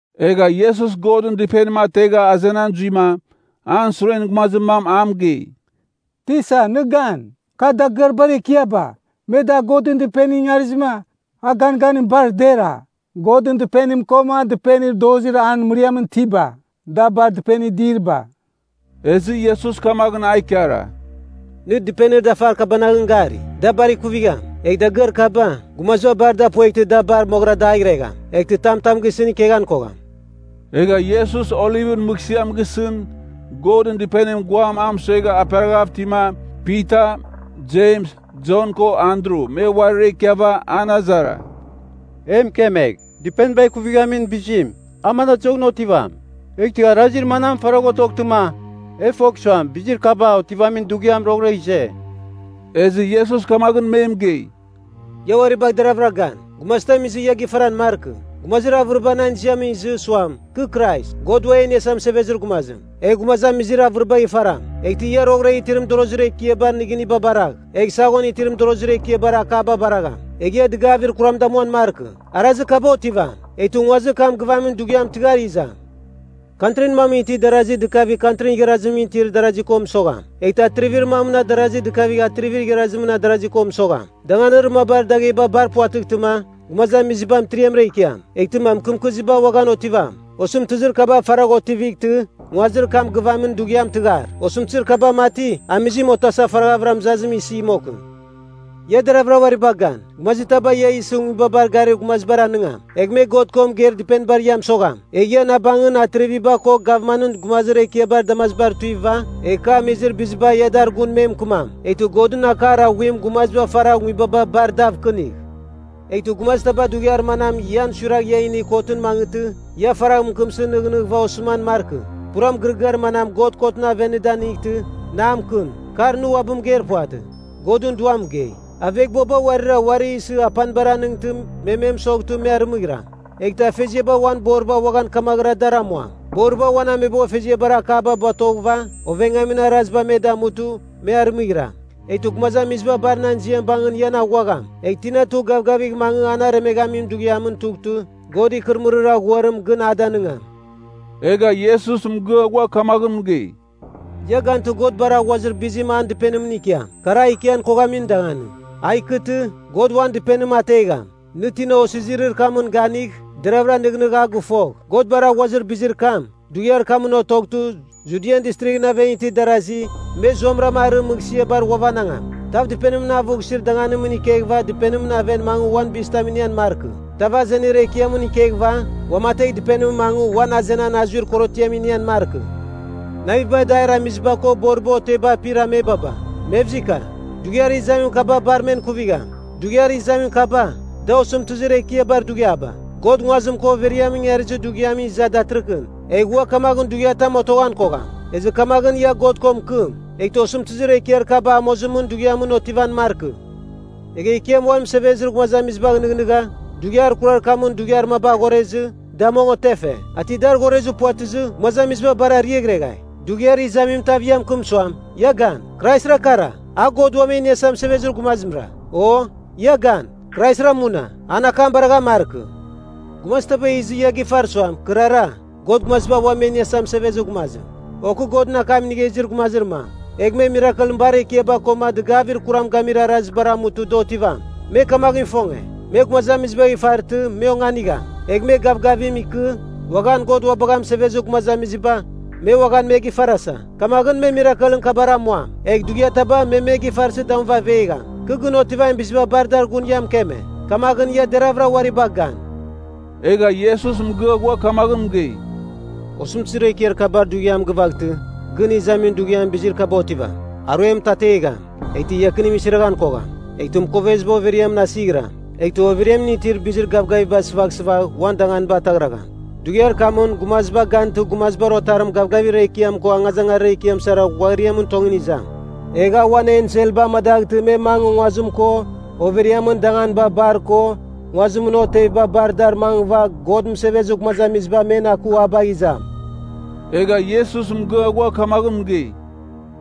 Egha Iesus Godɨn Dɨpenim ategha azenan zuima, an suren gumazir mam a mɨgei, “Tisa! Nɨ gan, kar dagɨar bar ekiaba, me dar Godɨn Dɨpenimɨn ingarizɨma, an ganganim bar dera! Godɨn Dɨpenim koma dɨpenir dozir an mɨriamɨn itiba, da bar dɨpenir diriba!” Ezɨ Iesus kamaghɨn a ikara, “Nɨ dɨpenir dafar kabanaghɨn gari? Da bar ikuvigham. Egh dagɨar kaba, gumaziba bar da pueghtɨ da bar moghɨra dagh iregham. Eghtɨ tam tam gisɨn ikeghan kogham.” Egha Iesus Olivɨn mɨghsɨam gisɨn, Godɨn Dɨpenimɨn guam a mɨsuegha aperaghav itima, Pita, Jems, Jon ko Andru me uarira ikiava an azara, “E mɨkemegh, dɨpeniba ikuvighamin bizim, a manadɨzoghɨn otivam? Eghtɨ arazir manam faragh otoghtɨma, e fogh suam bizir kaba otivamin dughiam roghɨra ize?” Ezɨ Iesus kamaghɨn me mɨgei, “Ia uari bagh deraghvɨra gan, gumazitam izɨ ia gifaran markɨ. Gumazir avɨriba nan ziamɨn izɨ, suam, ‘Kɨ Krais, God ua e iniasa mɨsevezir gumazim,’ egh gumazamizir avɨribagh ifaram. “Eghtɨ ia roghɨra itir mɨdorozir ekiabar nɨgɨniba baragh, egh saghon itir mɨdorozir ekiabar akaba baragham. Egh ia dɨgavir kuram damuan markɨ. Arazir kaba otivam, eghtɨ nguazir kam gɨvamin dughiam tɨghar izam. Kantrin mamɨn itir darazi dɨkavigh kantrin igharazimɨn itir darazi ko mɨsogham. Eghtɨ atrivir mamɨn adarazi dɨkavigh atrivir igharazimɨn adarazi ko mɨsogham. Danganir mabar dagheba bar puvatɨghtɨma, gumazamiziba mɨtiriamra ikiam. Eghtɨma mɨkɨmkɨziba uaghan otivam. Osɨmtɨzir kaba faragh otivightɨ nguazir kam gɨvamin dughiam tɨghar. Osɨmtɨzir kaba mati, amizim otasa faraghavɨra mɨzazim isi mokɨn. “Ia deravɨra uari bagh gan. Gumazitaba ia isɨ nguibabar garir gumazibar anɨngam. Egh me God ko mɨgeir dɨpenibar ia mɨsogham. Egh ia na bangɨn atriviba ko gavmanɨn gumazir ekiabar damazibar tuiva, egh ka amizir biziba ia dar gun me mɨkɨmam. Eghtɨ Godɨn akar aghuim gumaziba faragh nguibaba bar dav kɨnigh. Eghtɨ gumazitaba dughiar manam ian suiragh ia inigh kotɨn mangɨtɨ, ia faragh mɨkɨmsɨ nɨghnɨghɨva osɨman markɨ. Pura mɨgɨrɨgɨar manam God kotɨn aven nɨ danightɨ, na mɨkɨm. Kar nɨ uabɨ mɨgeir puvatɨ, Godɨn Duam mɨgei. “Aveghbuaba uarira uari isɨ apanibar anɨngtɨ me me mɨsoghtɨ me arɨmɨghiram. Eghtɨ afeziaba uan boriba uaghan kamaghɨra dar amuam. Boriba uan ameboghfeziabar akaba batoghɨva ovengamin arazibar me damutɨ, me arɨmɨghiram. Eghtɨ gumazamiziba bar nan ziam bangɨn ian aghuagham. Egh tina tugh gavgavigh mangɨ ana aremeghamin dughiamɨn tughtɨ, God ikɨrɨmɨrir aghuarim gɨn a danɨngam.” Egha Iesus mɨgɨa ghua kamaghɨn mɨgei, “Ia gantɨ God bar aghuazir bizim an dɨpenimɨn ikiam. Kar a ikian koghamin danganim. A ikɨtɨ, God uan Dɨpenim ategham. (Nɨ tina osizirir kamɨn ganigh, deravɨra nɨghnɨghɨva a gɨfogh.) God bar aghuazir bizir kam, dughiar kamɨn otoghtɨ, Judian Distrighɨn aven itir darasi me zuamɨram arɨ mɨghsɨabar ghuavanangam. Tav dɨpenimɨn avughsir danganimɨn ikeghɨva dɨpenimɨn aven mangɨ uan bizitam inian markɨ. Tav azenir ekiamɨn ikeghɨva uamategh dɨpenimɨn mangɨ uan azenan azuir korotiam inian markɨ. Naviba adair amiziba ko boriba oteba apir amebaba, mevzika; dughiar izamin kaba bar men ikuvigham! Dughiar izamin kaba, da osɨmtɨzir ekiabar dughiaba. God nguazim ko overiamɨn ingarizir dughiamɨn iza datɨrɨkɨn, egh ua kamaghɨn dughiatam otoghan kogham. Ezɨ kamaghɨn ia God ko mɨkɨm, eghtɨ osɨmtɨzir ekiar kaba amozimɨn dughiamɨn otivan markɨ. Egha Ekiam uan mɨsevezir gumazamizibagh nɨghnɨgha, dughiar kurar kamɨn dughiar maba aghorezɨ da mong otefe. A ti dar aghorezir puvatɨzɨ gumazamiziba bar ariaghreghai. “Dughiar izamim tav ia mɨkɨm suam, ‘Ia gan, Kraisra kara! A God Ua E Iniasa Mɨsevezir Gumazimra,’ o, ‘Ia gan, Kraisra muna!’ an akam baraghan markɨ. Gumazitaba izɨva ia gifar suam, ‘Kɨrara, God Gumazamiziba Ua Me Iniasa Mɨsevezir Gumazim,’ o ‘kɨ Godɨn akam inigha izir gumazir mam,’ egh me mirakelɨn bar ekiaba koma dɨgavir kuram gamir arazibar amutɨ da otivam. Me kamaghɨn ifonge, me gumazamizibagh ifaraghtɨ, me onganigham. Egh me gavgavim ikɨ, uaghan God ua bagha mɨsevezir gumazamiziba, me uaghan me gifarasa. Kamaghɨn me mirakelɨn kabar amuam. Egh dughiataba me me gifarsɨ damuva avegham. Kɨ gɨn otivamin biziba bar dar gun ia mɨkeme. Kamaghɨn ia deravɨra uari bagh gan.” Egha Iesus mɨgɨa ghua kamaghɨn mɨgei, “Osɨmtɨzir ekiar kabar dughiam gɨvaghtɨ, gɨn izamin dughiamɨn bizir kaba otivam. ‘Aruem mɨtategham, eghtɨ iakinim isiraghan kogham; eghtɨ mɨkoveziba overiamɨn asighɨram, eghtɨ overiamɨn itir bizir gavgaviba sɨvaghsɨvagh, uan danganiba ataghragham.’ Dughiar kamɨn gumaziba gantɨ Gumazibar Otarim gavgavir ekiam ko angazangarir ekiam sara ghuariamɨn tongɨn izam. Egh a uan enselba amadaghtɨ me mangɨ nguazim ko overiamɨn danganiba bar ko nguazimɨn oteviba bar dar mangɨva God mɨsevezir gumazamiziba men aku a bagh izam.” Egha Iesus mɨgɨa ghua kamaghɨn mɨgei,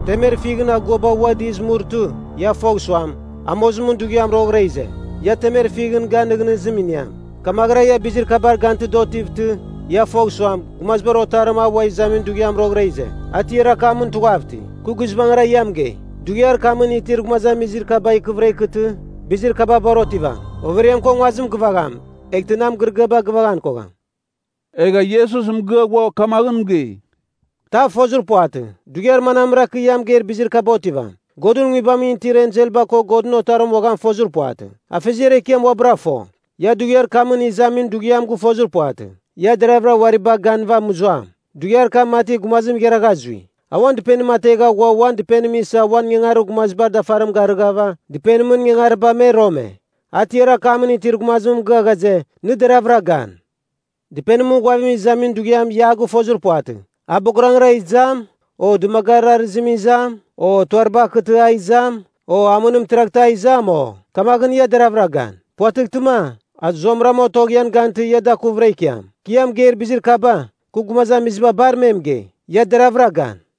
“Temer fighɨn aguaba ua dɨz murtɨ, ia fogh suam, amozimɨn dughiam roghɨra ize. Ia temer fighɨn gan nɨghnɨzim iniam. Kamaghɨra ia bizir kabar gantɨ da otivtɨ, ia fogh suam, Gumazibar Otarim a ua izamin dughiam roghɨra ize. A tiar akamɨn tughav iti. Kɨ guizbangɨra ia mɨgei dughiar kamɨn itir gumazamizir kaba ikɨvɨra ikɨtɨ bizir kaba bar otivam. Overiam ko nguazim gɨvagham, eghtɨ nan mɨgɨrɨgɨaba gɨvaghan kogham.” Egha Iesus mɨgɨa ghua kamaghɨn mɨgei, “Tav fozir puvatɨ, dughiar manamra kɨ ia mɨgeir bizir kaba otivam. Godɨn Nguibamɨn itir enselba ko Godɨn Otarim uaghan fozir puvatɨ. Afeziar Ekiam uabɨra fo. “Ia dughiar kamɨn izamin dughiam gɨfozir puvatɨ. Ia deravɨra uari bagh ganɨva mɨzuam. Dughiar kam mati gumazim igharagha zui. A uan dɨpenim ategha ghua uan dɨpenim isa uan ingangarir gumazibar dafarim garighava dɨpenimɨn ingangariba me rome. A tiar akamɨn itir gumazimɨn mɨgɨa ghaze, nɨ deravɨra gan. “Dɨpenimɨn ghuavim izamin dughiam ia a gɨfozir puvatɨ, a bogarangra izam, o dɨmagarir arɨzimɨn izam, o tuariba akɨtɨ a izam, o amɨnim tiraghtɨ a izam, o? Kamaghɨn ia deravɨra gan. Puvatɨghtɨma, a zuamɨram otogh ian gantɨ, ia dakuvɨra ikiam. Kɨ ia mɨgeir bizir kaba, kɨ gumazamiziba bar me mɨgei, ‘Ia deravɨra gan!’”